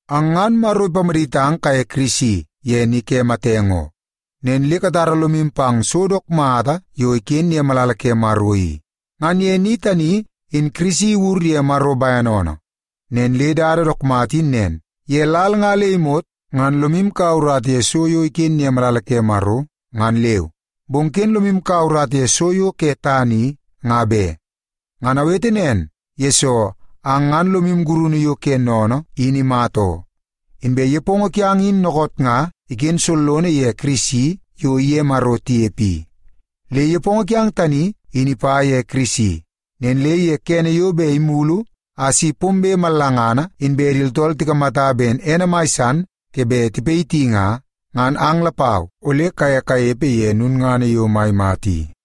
Ang ngan Maro ipamaditang kaye Kirisi ye ni ke matenge oo. Nen le katara lomu pang so dook mata yo iken ye malala ke Maro i. Ngan ye ni tani, in Kirisi iwur ye Maro bene oonoo. Nen le dada dook mata in nen, ye lal nga le imot ngan lomu kaua urata ye so yo iken ye malala ke Maro, ngan leu. Bong ken lomu kaua urata ye so yo ke tana i, nga be. Ngan awete nen, yesoo ang ngan lomu gurunu yo ke sennene in imata oo. Inbe nepongo kiang in dookoot nga iken sollono ye Kirisi yo iye Maro tinepe i. Le nepongo kiang tani, in ipa ye Kirisi. Nen le ye kene yo bet imulu a si pombe mallangana inbe di tooltool tikamata ben ene mai san ke bet tipayiti nga, ngan ang lapau ole kaye kanepe ye lulngana yo mai mata i.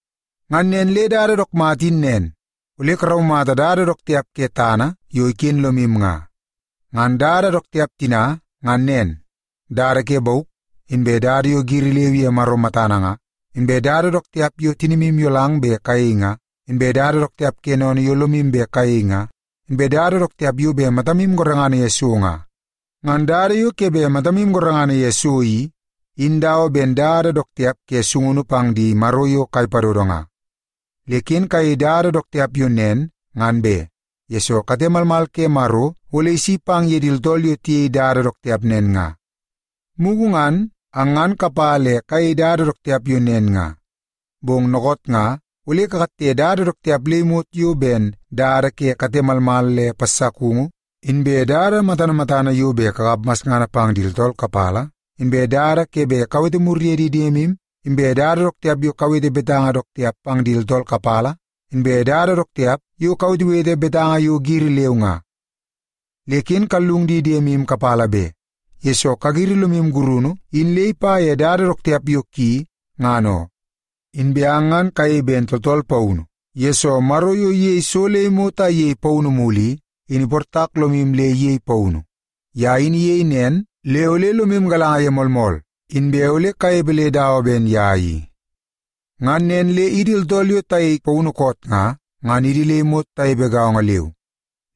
Ngan nen le dada dook mata in nen, ole karaumata dada dook tiap ke tana yo iken lomu nga. Ngan dada dook tiap tina ngan nen; dada ke bauk, inbe dada yo giri leu ye Maro matana nga, inbe dada dook tiap yo tinimu iyolang bet kayei nga, inbe dada dook tiap ke sennene yo lomu bet kayei nga, inbe dada dook tiap yo bet matamu gorengana ye so nga. Ngan dada yo ke bet matamu gorengana ye so i, in dawa ben dada dook tiap ke sungunu pang di maro yo kai padodo nga. Le ken kayei dada dook tiap yo nen ngan be, yesoo kate malmal ke Maro ole isi pang ye di tooltool yo tiyei dada dook tiap nen nga. Mugu ngan, ang ngan kapa le kayei dada dook tiap yo nen nga. Bong dookoot nga ole kakatte dada dook tiap le imot yo ben dada ke kate malmal le passakungu, inbe dada matana matana yo bet kakap masngana pang di tooltool kapala, inbe dada yo ke bet kawete mur ye di diemu, inbe dada dook tiap yo kawete betanga dook tiap pang di tooltool kapala, inbe dada dook tiap yo kawetewete betanga yo giri leu nga. Le ken kallung di diemu kapala be, yesoo kagiri lomu gurunu in le ipa ye dada dook tiap yo ki, ngan oo. Inbe ang ngan kayei ben tooltool paunu, yesoo Maro yo iyei so le imot a iyei paunu mulu i, in iportak lomu le iyei paunu. Ye in iyei nen le ole lomu galanga ye moolmool, inbe ole kanepe le dawa ben ye i. Ngan nen le idi tooltool yo tayei paunu koot nga, ngan idi le imot tanepe gaongo leu.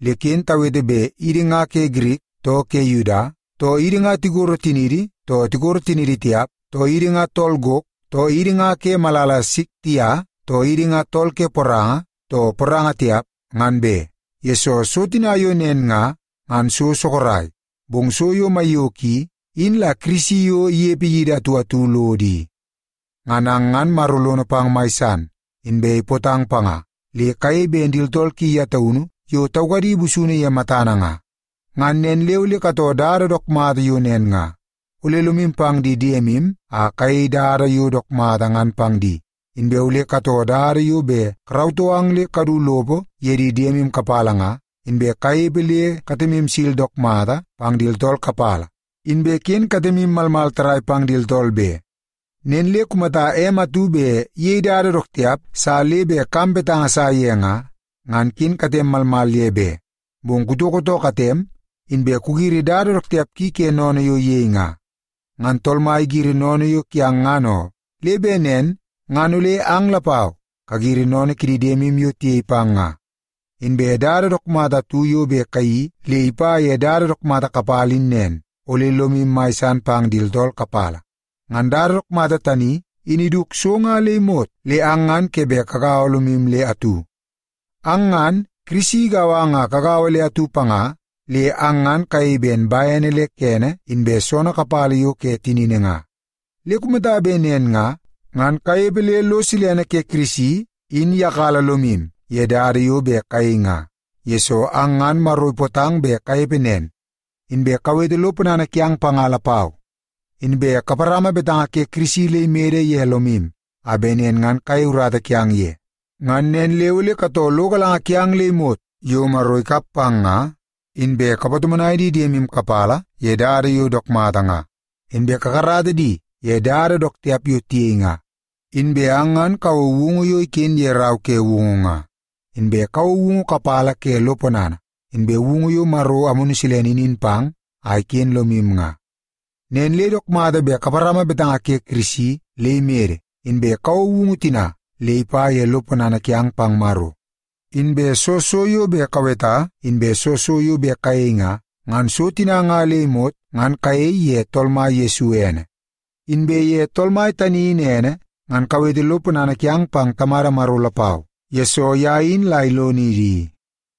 Le ken tawete bet idi nga ke Girik too ke Yuda, too idi nga tikoro tiniidi too tikoro tiniidi tiap, too idi nga tool gok, too idi nga ke malala Siktia, too idi nga tool ke poranga too poranga tipa, ngan be, yesoo so tina yo nen nga, ngan so sorok. Bong so yo maiyoko i, in la Kirisi yo inepe idi atu atu lodo i. Ngan ang ngan Maro lono pang mai san, inbe ipootang panga, le kayei ben di tooltool ki ye taunu yo taukadi busunu ye matana nga. Ngan nen le ole katoo dada dook mata yo nen nga. Ole lomu pang di diemu a kayei dada yo dook mata ngan pang di, inbe ole katoo dada yo bet karautoo ang le kadu lopo ye di diemu kapala nga, inbe kanepe le katemu sil dook mata pang di tooltool kapala, inbe ken katemu malmal tarrai pang di tooltool be. Nen le kumata em atu bet iyei dada dook tiap sa le bet kam betanga sa ye nga, ngan ken katem malmal ye be, bong kutoko too katem, inbe kugiri dada dook tiap ki ke sennene yo iyei nga. Ngan Tool Mai igiri sennene yo kiang ngan oo, le bet nen ngan ole ang lapau kagiri sennene kidi diemu yo tiyei pang nga. Inbe dada dook mata atu yo bet kayeii le ipa ye dada dook mata kapala in nen, ole lomu mai san pang di tooltool kapala. Ngan dada dook mata tani in iduk so nga le imot le ang ngan ke bet kagaua lomu le atu. Ang ngan, Kirisi igau ang a kagaua le atu panga, le ang ngan kayei ben bene le kene inbe soonoo kapala yo ke tinini nga. Le kumata bet nen nga, ngan kanepe le lo silene ke Kirisi in iyakala lomu ye dada yo bet kayei nga, yesoo ang ngan Maro ipootang bet kanepe nen. Inbe kawete lo ponana kiang panga lapau. Inbe kaparama betanga ke Kirisi le imede ye lomu, a bet nen ngan kayei urata kiang ye. Ngan nen le ole katoo lo galanga kiang le imot yo Maro ikap pang nga, inbe kapatomonai di diemu kapala ye dada yo dook mata nga, inbe kakarata di ye dada dook tiap yo tiyei nga. Inbe ang ngan kawou woungu yo iken ye Rau ke Woungu nga, inbe woungu kapala ke lo ponana, inbe woungu yo Maro Amunu Silene inin pang a iken lomu nga. Nen le dook mata bet kaparama betanga ke Kirisi le imede, inbe kawou woungu tina le ipa ye lo ponana kiang pang Maro. Inbe soo so yo bet kaweta inbe soo so yo bet kayei nga, ngan so tina nga le imot ngan kayei ye Tool Mai Yesu ene. Inbe ye Tool Mai tani in ene, ngan kawete lo ponana kiang pang Tamada Maro lapau, yesoo ye in la ilonidi i.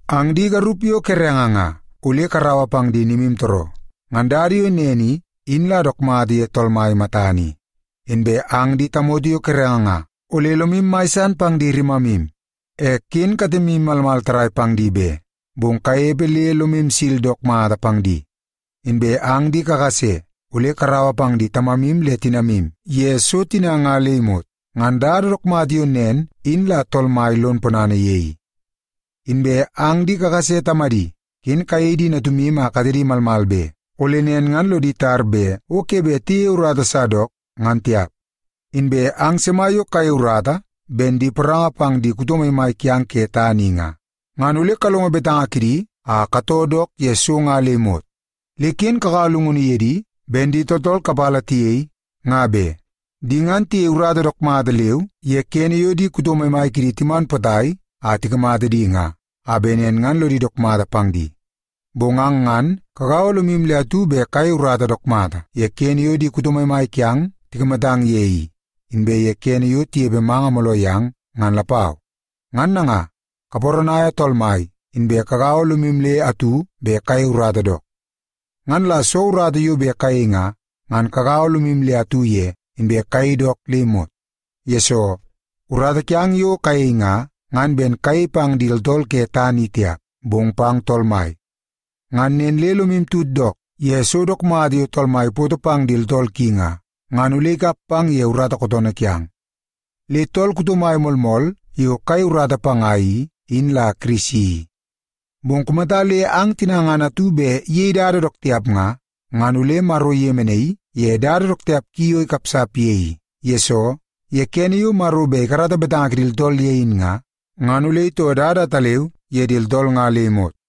Ang di garup yo kerenge nga, ole karaua pang di nimutooroo. Ngan dada yo nen i, in la dook mata ye Tool Mai matana i. Inbe ang di tamoto yo kerenge nga, ole lomu mai san pang di rimamu. E ken katemu malmal tarrai pang di be, bong kanepe le lomu sil dook mata pang di. Inbe ang di kakase, ole karaua pang di tamamu le di tinamu ye so tina nga le imot. Ngan dada dook mata yo nen in la Tool Mai lon ponana ye i. Inbe ang di kakase tamadi, ken kayei di natumu a katedi malmal be. Ole nen ngan lodi tar bet o ke bet tiyeie urata sa dook, ngan tiap. Inbe ang sima yo kayei urata ben di poranga pang di kuto maimai kiang ke tana i nga, ngan ole kalongo betanga kidi a katoo dook ye so nga le imot. Le ken kakaua llungunu ye di ben di tooltool kapala tiyei, nga be. Di ngan tiyei urata dook mata leu ye kene yo di kuto maimai kidi timan potai a tikamata di nga, a bet nen ngan lodi dook mata pang di. Bong ang ngan kagaua lomu le atu bet kayei urata dook mata ye kene yo kuto mai kiang ikamatang ye i, inbe ye kene yo inepe manga mooloo yang, ngan lapau. Ngan nanga, kaparanaia Tool Mai, inbe kagaua lomu le atu bet kayei urata dook. Ngan la soo urata yo bet kayei nga, ngan kagaua lomu le atu ye, inbe kayei dook le imot. Yesoo, urata kiang yo kayei nga, ngan ben kayei pang di tooltool ke tana i tiap, bong pang Tool Mai. Ngan nen le lomu tut dook ye so dook mata yo Tool Mai ipoto pang di tooltool ki nga, ngan ole ikap pang ye urata kootoonoo kiang. Le tool kuto mai moolmool yo kayei urata panga i, in la Kirisi i. Bong kumata le ang tina atu bet iyei dada dook tiap nga, ngan ole Maro iyemenaii ye dada dook tiap ki yo ikapsap ye i. Yesoo, ye kene yo Maro bet ikarata betanga kidi tooltool ye in nga, ngan ole itoo dada ataleu ye di tooltool nga le imot.